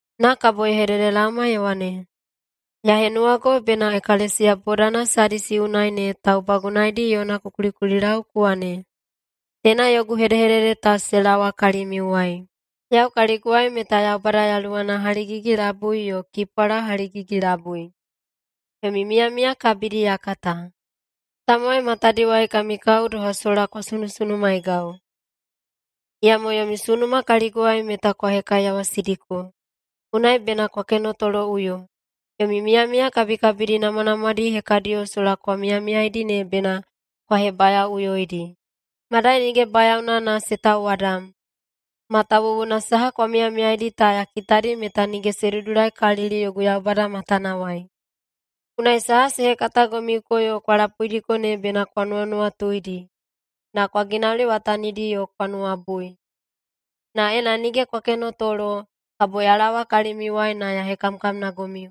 Na kabo ye hededelaoma ye wane, “Ya henuwago bena ekalesiya bodana Sadisi unai ne taubagunaedi yona ku kulikulilau ku wane, Teina yogu hedehedede ta se laowa kalimiuwai. Yau kaliguwai meta Yaubada Yaluwana haligigi-labui yo kipwala haligigi-labui. Yomi miyamiya kabidi ya kata. Tamowai matadiwai kami kao doha sola kwa sunusunumaegau, iyamo yomi sunuma kaliguwai meta kwa hekaiyawasidiko. Unai bena kwa kenotoloꞌuyo! Yomi miyamiya kabikabidi namwanamwadi hekadiyo sola kwa miyamiyaidi ne bena kwa hebayaoꞌuyoidi, madai nige bayaona na se tauwadam. Matawuwuna saha kwa miyamiyaidi ta ya kitadi meta nige se dudulaikalili yogu Yaubada matanawai. Unai saha se hekatagomiuko yo kwa lapuidiko ne bena kwa nuwanuwatuidi, na kwa ginauliwatanidi yo kwa nuwabui. Na ena nige kwa kenotolo, kabo ya laowa kalimiuwai na ya hekamkamnagomiu.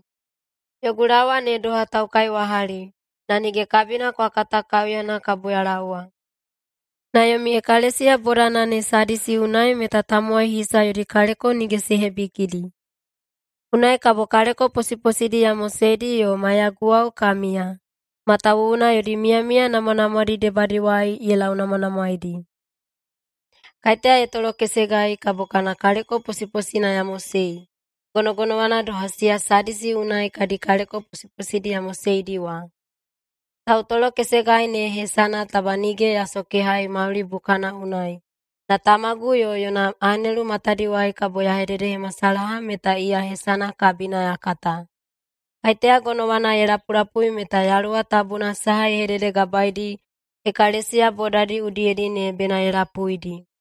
Yogu laowa ne doha taukaiwahali, na nige kabina kwa kata kaiuyana kabo ya laowa. Na yomi ekalesiya bodana ne Sadisi unai meta tamowai hisa yodi kaleko nige se hebikidi. Unai kabo kaleko posiposidi ya moseidi yo maiyaguwao ka miya, matawuwuna yodi miyamiya namwanamwadi debadiwai ye launamwanamwaeidi. Kaiteya ye tolokesegai, kabo kana kaleko posiposina ya mosei, gonogonowana doha siya Sadisi unai kadi kaleko posiposidi ya moseidi wa. Tautolokesegai ne hesana taba nige ya sokehai mauli bukana unai, na Tamagu yo yona anelu matadiwai kabo ya hededehemasalaha meta iya hesana kabina ya kata. Kaiteya gonowana ye lapulapui meta Yaluwa Tabuna saha ye hededegabaedi ekalesiya bodadi udiyedi ne bena ye lapuidi.”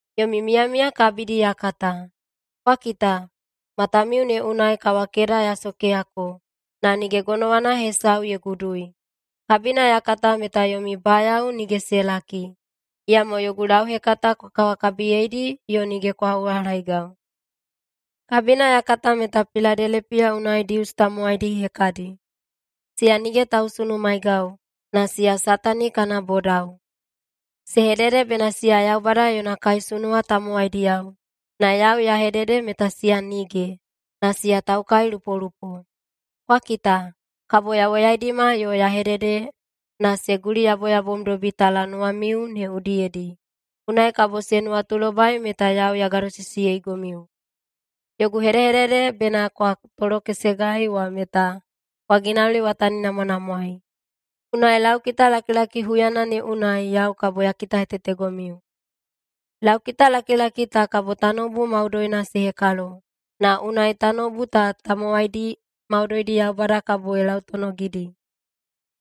Yomi miyamiya kabidi ya kata. Kwa kita! Matamiu ne unai kawakeda ya sokeyako, na nige gonowana hesau ye gudui. Kabina ya kata meta yomi bayao nige se laki. Iyamo yogu lauhekata kwa kawakabiyeidi yo nige kwa uhalaegau. Kabina ya kata meta Piladelepiya unai Dius tamowaidi hekadi. Siya nige tausunumaegau, na siya Satani kana bodao. Se hedede bena siya Yaubada yona kaisunuwa tamowaidiyao, na yau ya hedede meta siya nige, na siya taukailupolupo. Kwa kita! Kabo ya woyaidima yo ya hedede na se guliyaboyabomdobi talanuwamiu ne udiyedi, unai kabo se nuwatulobai meta yau ya gadosisiyeigomiu. Yogu hedehedede bena kwa tolokesegai wa meta kwa ginauliwataninamwanamwaei. Unai laukitalakilaki huyana ne unai yau kabo ya kitahetetegomiu. Laukitalakilaki ta kabo tanoubu maudoina se hekalo, na unai tanoubu ta tamowaidi maudoidi Yaubada kabo ye lautonogidi.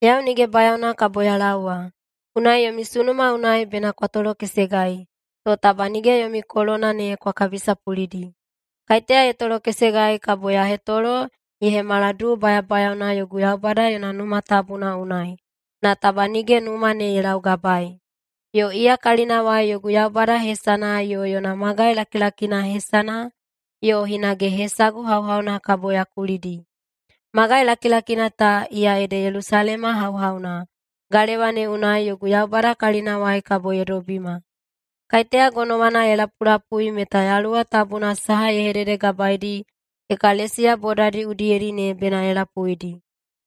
Yau nige bayaona kabo ya laowa. Unai yomi sunuma unai bena kwa tolokesegai, to taba nige yomi kolona ne kwa kabisapulidi. Kaiteya ye tolokesegai kabo ya hetolo ye hemala duu bayabayaona yogu Yaubada yona Numa Tabuna unai, na taba nige numa ne ye laugabaei. Yo iya kalinawai yogu Yaubada hesana yo yona magai lakilakina hesana yo hinage hesagu hauhauna kabo ya kulidi. Magai lakilakina ta, iya ede Yelusalema hauhauna, galewa ne unai yogu Yaubada kalinawai kabo ye dobima. Kaiteya gonowana ye lapulapui meta Yaluwa Tabuna saha ye hededegabaedi ekalesiya bodadi udiyedi ne bena ye lapuidi.”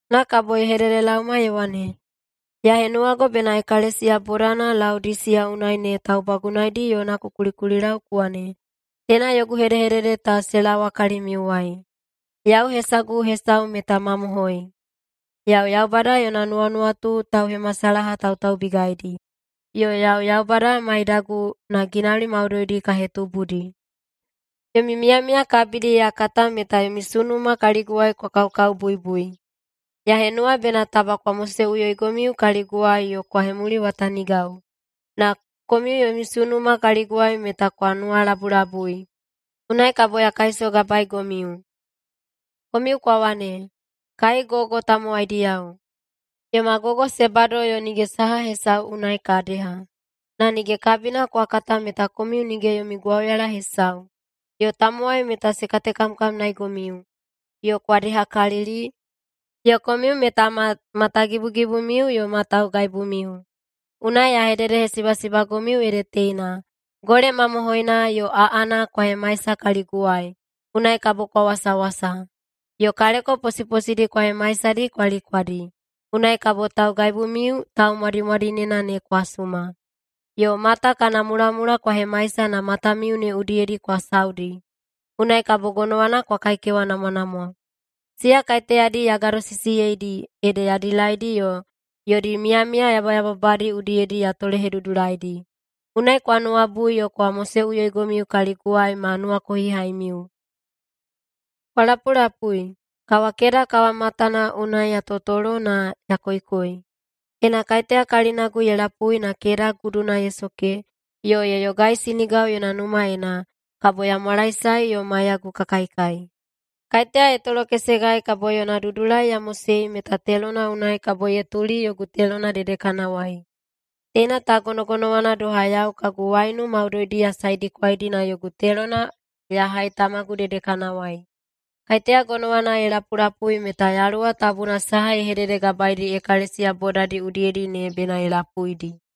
Na kabo ye hededelaoma ye wane, “Ya henuwago bena ekalesiya bodana Laodisiya unai ne taubagunaedi yona ku kulikulilau ku wane, Teina yogu hedehedede ta se laowa kalimiuwai. Yau hesagu hesau meta ‘Mamohoi’. Yau Yaubada yona nuwanuwatu tauhemasalahatautaubigaidi, yo yau Yaubada maidagu na ginauli maudoidi ka hetubudi. Yomi miyamiya kabidi ya kata meta yomi sunuma kaliguwai kwa kaokaobuibui. Ya henuwa bena taba kwa moseꞌuyoigomiu kaliguwai yo kwa hemuliwatanigau. Na komiu yomi sunuma kaliguwai meta kwa nuwalabulabui, unai kabo ya kaisogabaegomiu. Komiu kwa wane, ‘Kai gogo tamowaidiyao! Yoma gogo se bado yo nige saha hesau unai ka deha.’ Na nige kabina kwa kata meta komiu nige yomi gwauyala hesau, yo tamowai meta se katekamkamnaeigomiu, yo kwa dehakalili, yo komiu meta ma matagibugibumiu yo ma taugaibumiu. Unai ya hededehesibasibagomiu ede teina: Gole mamohoina yo aꞌana kwa hemaisa kaliguwai, unai kabo kwa wasawasa. Yo kaleko posiposidi kwa hemaisadi kwa likwadi, unai kabo taugaibumiu taumwadimwadinena ne kwa suma. Yo mata kana mulamula kwa hemaisa na matamiu ne udiyedi kwa saudi, unai kabo gonowana kwa kaikewanamwanamwa. Siya kaiteyadi ya gadosisiyeidi, ede ya dilaidi yo yodi miyamiya yabayababadi udiyedi ya tolehedudulaidi. Unai kwa nuwabui yo kwa moseꞌuyoigomiu kaliguwai ma nuwakohihaimiu. Kwa lapulapui! Kawakeda kawamatana unai ya totolo na ya koikoi. Ena kaiteya kalinagu ye lapui na keda guduna ye soke yo ye yogaisinigau yona numaena, kabo ya mwalaesae yo maiyagu ka kaikai. Kaiteya ye tolokesegai kabo yona dudulai ya mosei meta telona unai kabo ye tuli yogu telona dedekanawai. Teina ta gonogonowana doha yau kagu waiunu maudoidi ya saedikwaidi na yogu telona ya hai Tamagu dedekanawai. Kaiteya gonowana ye lapulapui meta Yaluwa Tabuna saha ye hededegabaedi ekalesiya bodadi udiyedi ne bena ye lapuidi.”